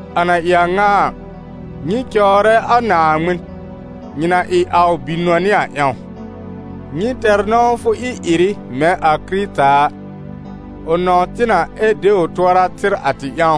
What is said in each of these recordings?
A na ɩ a ŋa a, nyɩ cɔwrɛ a Naaŋmɩn, nyɩ na ɩ a ʋ bi-nɔnɩ a ƴãw. Nyɩ tɛr nɔ̃wfʋ ɩ-ɩrɩ mɛ̃ a Kɩrɩta a, ʋ nɔ̃w tɩ na, ɛ de ʋ tʋɔra tɩr a tɩ ƴãw,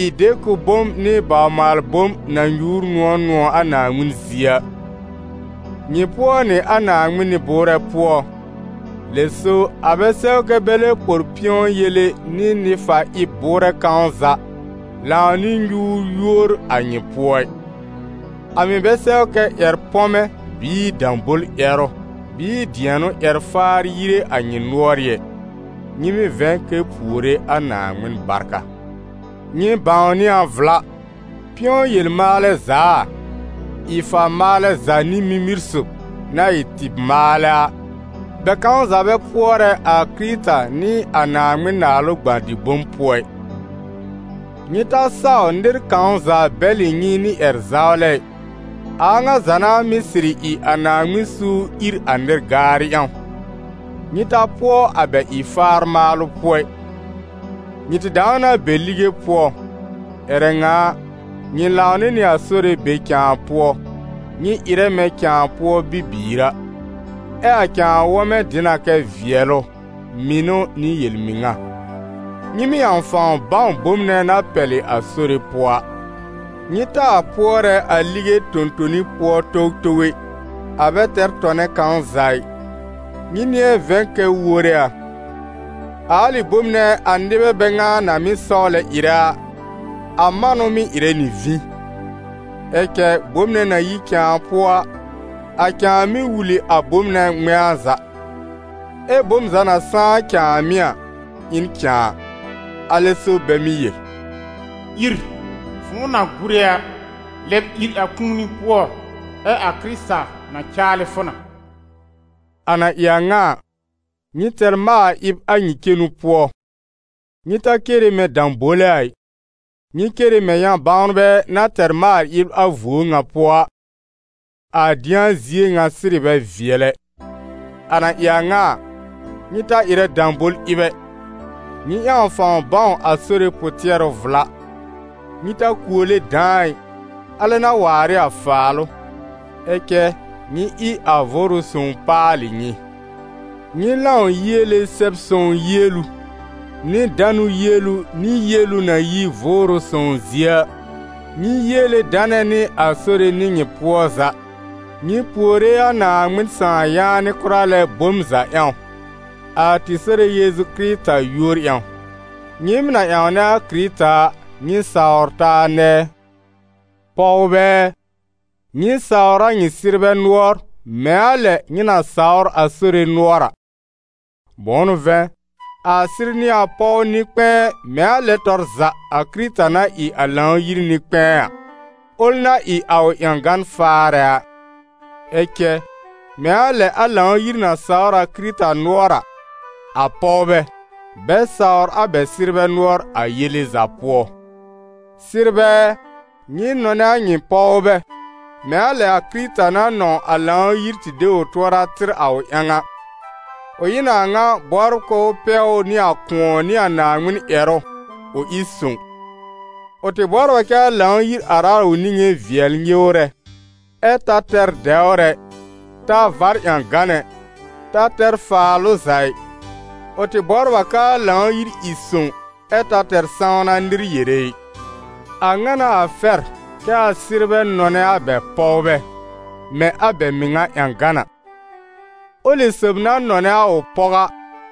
ɩ dekʋb-bom nɩ bawr-maal-bom na nyuur nʋ̃ɔ̀ nʋ̃ɔ̀ a Naaŋmɩn zie a. Nyɩ pʋɔ nɩ a Naaŋmɩn nɩ-bʋʋrɛ pʋɔ, lɛ so a bɛ sɛw kɛ́ bɛ lɛ por pɩ̃ɔ yele nɩ nɩ-fa-ɩb bʋʋrɛ kãw za lãw nɩ nyuur yúor a nyɩ pʋɔ ɩ. A mɩ̀ bɛ sɛw kɛ́ ƴɛr-pɔmɛ bɩɩ dãbol-ƴɛrʋ bɩɩ dɩɛnʋ ƴɛr-faar yire a nyɩ nʋɔrɩ́ ɛ. Nyɩ mɩ́ vɛ̃ kɛ puore a Naaŋmɩn barka. Nyɩ bãwnɩ a vla, pɩ̃ɔ yel-maalɛ za a, ɩ-fa-maalɛ za nɩ mimir sob, na ɩ tɩɩb-maalɛ a, bɛ kãw za bɛ pʋɔrɛ a Kɩrɩta nɩ a Naaŋmɩn Naalʋ gbã-dɩ-bom pʋɔ ɩ. Nyɩ ta saw nɩr kãw za bɛlɩ nyɩ nɩ ƴɛr-zawlɛ ɩ, a a ŋa za n'a mɩ́ sɩrɩ ɩ a Naaŋmɩn suur ìr a nɩ-gaarɩ ƴãw. Nyɩ ta pʋɔ a bɛ ɩ-faar maalʋ pʋɔ ɩ. Nyɩ tɩ dãw na be lige pʋɔ; ƴɛrɛ ŋa a, nyɩ lãw nɩ nɩ a Sore be cãa pʋɔ, nyɩ ɩrɛ mɛ̃ cãa pʋɔ bibiir a. Ɛ a cãa wɔ̃mɛ dɩ na kɛ vɩɛlʋ, mɩnʋ, nɩ yel-mɩŋa. Nyɩ mɩ́ ƴãw fãw bãw bom nɛ na pɛlɩ a Sore pʋɔ a. Nyɩ taa pʋɔrɛ a lige tõ-toni pʋɔ towtow ɛ, a bɛ tɛr tɔnɛ kãw za ɩ, nyɩ nɩ̃ɛ vɛ̃ kɛ wore a. A alɩ bome nɛ a nɩbɛ bɛ ŋa na mɩ́ sɔwlɛ ɩrɛ a, a manʋ mɩ́ ɩrɛ nɩ vĩ. Ɛ cɛ bom nɛ na yi cãa pʋɔ a, a cãa mɩ́ wul ɩ a bom nɛ ŋmɛ̃a za. Ɛ bom za na sãá cãàmɩ́ a ɩ n cãa. Alɛ so bɛ mɩ́ yel: «Ìr, fʋ̃ʋ na gúre a, lɛb ìr a kũuni pʋɔ, ɛ a Kɩrɩta na caalɩ fʋ na.» A na ɩ a ŋa a, nyɩ tɛr maal-ɩb a nyɩ cenu pʋɔ: nyɩ ta cere mɛ̃ dãbole a ɩ, nyɩ cere mɛ̃ yã-bãwnbɛ na tɛr maal-ɩb a vuo ŋa pʋɔ a, a dɩ̃a zie ŋa sɩrɩ bɛ vɩɛl ɛ. A na ɩ a ŋa a, nyɩ ta ɩrɛ dãbol-ɩb ɛ, nyɩ ƴãw fãw bãw a Sore pʋ-tɩɛrʋ vla. Nyɩ ta kuole dãa ɩ, alɛ n'a waar ɩ a faalʋ; ɛ cɛ nyɩ ɩ a Vʋʋrʋ Sõw paalɩ nyɩ. Nyɩ lãw yiele Sɛb-sõw yielu, nɩ danʋ yielu nɩ yielu na yi Vʋʋrʋ Sõw zie a. Nyɩ yiele danɛ nɩ a Sore nɩ nyɩ pʋɔ za. Nyɩ puore a Naaŋmɩn Sãà yaanɩ kʋra lɛ bom za ƴãw, a tɩ Sore Yeezu Kɩrɩta yúor ƴãw. Nyɩɩm na ƴãwnɛ a Kɩrɩta a, nyɩ sawr taa nɛɛ. Pɔwbɛ ɛ, nyɩ sawr a nyɩ sɩrbɛ nʋɔr, mɛ̃ a lɛ nyɩ na sawr a Sore nʋɔr a. Bʋ̃ʋ n'ʋ vɛ̃, a sɩr n'ɩ a pɔw nɩ-kpɛ̃ɛ mɛ̃ a lɛn tɔr za a Kɩrɩta na ɩ a Lãw-yir nɩ-kpɛ̃ɛ a, ʋl na ɩ a ʋ ƴãgan faarɛ a. Ɛ cɛ mɛ̃ a lɛ a Lãw-yir na sawr a Kɩrɩta nʋɔr a, a pɔwbɛ, bɛ sawr a bɛ sɩrbɛ nʋɔr a yele za pʋɔ. Sɩrbɛ ɛ, nyɩ nɔnɛ a nyɩ pɔwbɛ mɛ̃ a lɛ a Kɩrɩta na nɔ̃w a Lãw-yir tɩ de ʋ tʋɔra tɩr a ʋ ƴãw a. Ʋ ɩ n a ŋa bɔbr k'ʋʋ pɛw ʋ nɩ a kʋ̃ɔ nɩ a Naaŋmɩn ƴɛrʋ, ʋ ɩ sõw. Ʋ tɩ bɔbr a kɛ́ a Lãw-yir ar a ʋ niŋé vɩɛl nyɩwrɛ, ɛ ta tɛr dɛwr ɛ, ta vár ƴãgan ɛ, ta tɛr faalʋ za ɩ, ʋ tɩ bɔbr a k'aa Lãw-yir ɩ sõw ɛ ta tɛr sãwna nɩr yere ɩ. A ŋa n'a a fɛr kɛ a sɩrbɛ nɔnɛ a bɛ pɔwbɛ, mɛ̃ a bɛ mɩŋa ƴãgan a. Ʋlɩ sob na nɔnɛ a ʋ pɔw a,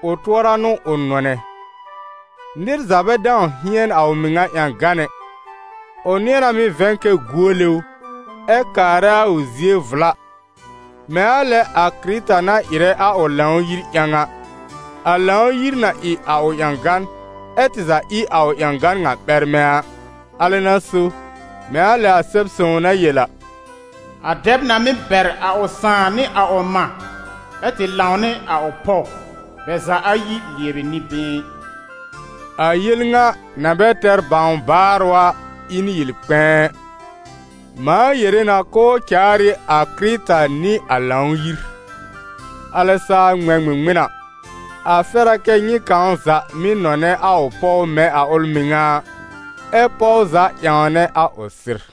ʋ tʋɔra n'ʋ ʋ nɔnɛ. Nɩr za bɛ dãw hɩɛn a ʋ mɩŋa ƴãgan ɛ, ʋ nɩ̃ɛ na mɩ́ vɛ̃ kɛ guole ʋ, ɛ kaarɛ a ʋ zie vla, mɛ̃ a lɛ a kɩrɩta na ɩrɛ a ʋ Lãw-yir ƴãw a, a Lãw-yir na ɩ a ʋ ƴãgan, ɛ tɩ za ɩ a ʋ ƴãgan ŋa ɓɛrmɛ a. Alɛ n'a so, mɛ̃ a lɛ a Sɛb-sõw na yel a: « A dɛb na mɩ́ bɛr a ʋ sãà nɩ a ʋ mã, ɛ tɩ lãw nɩ a ʋ pɔw, bɛ za ayi lɩɛbɩ nɩ-been.» A yel ŋa, na bɛ tɛr bãw baarʋ a, ɩ n yel kpɛ̃ɛ: mãa yere na k'ʋʋ caar ɩ a Kɩrɩta nɩ a Lãw-yir. Alɛ saa ŋmɛ̃ ŋmɩŋmɩn a, a fɛr a kɛ nyɩ kãw za mɩ́ nɔnɛ a ʋ pɔw mɛ̃ a ʋl mɩŋa a, ɛ pɔw za ƴãwnɛ a ʋ sɩr.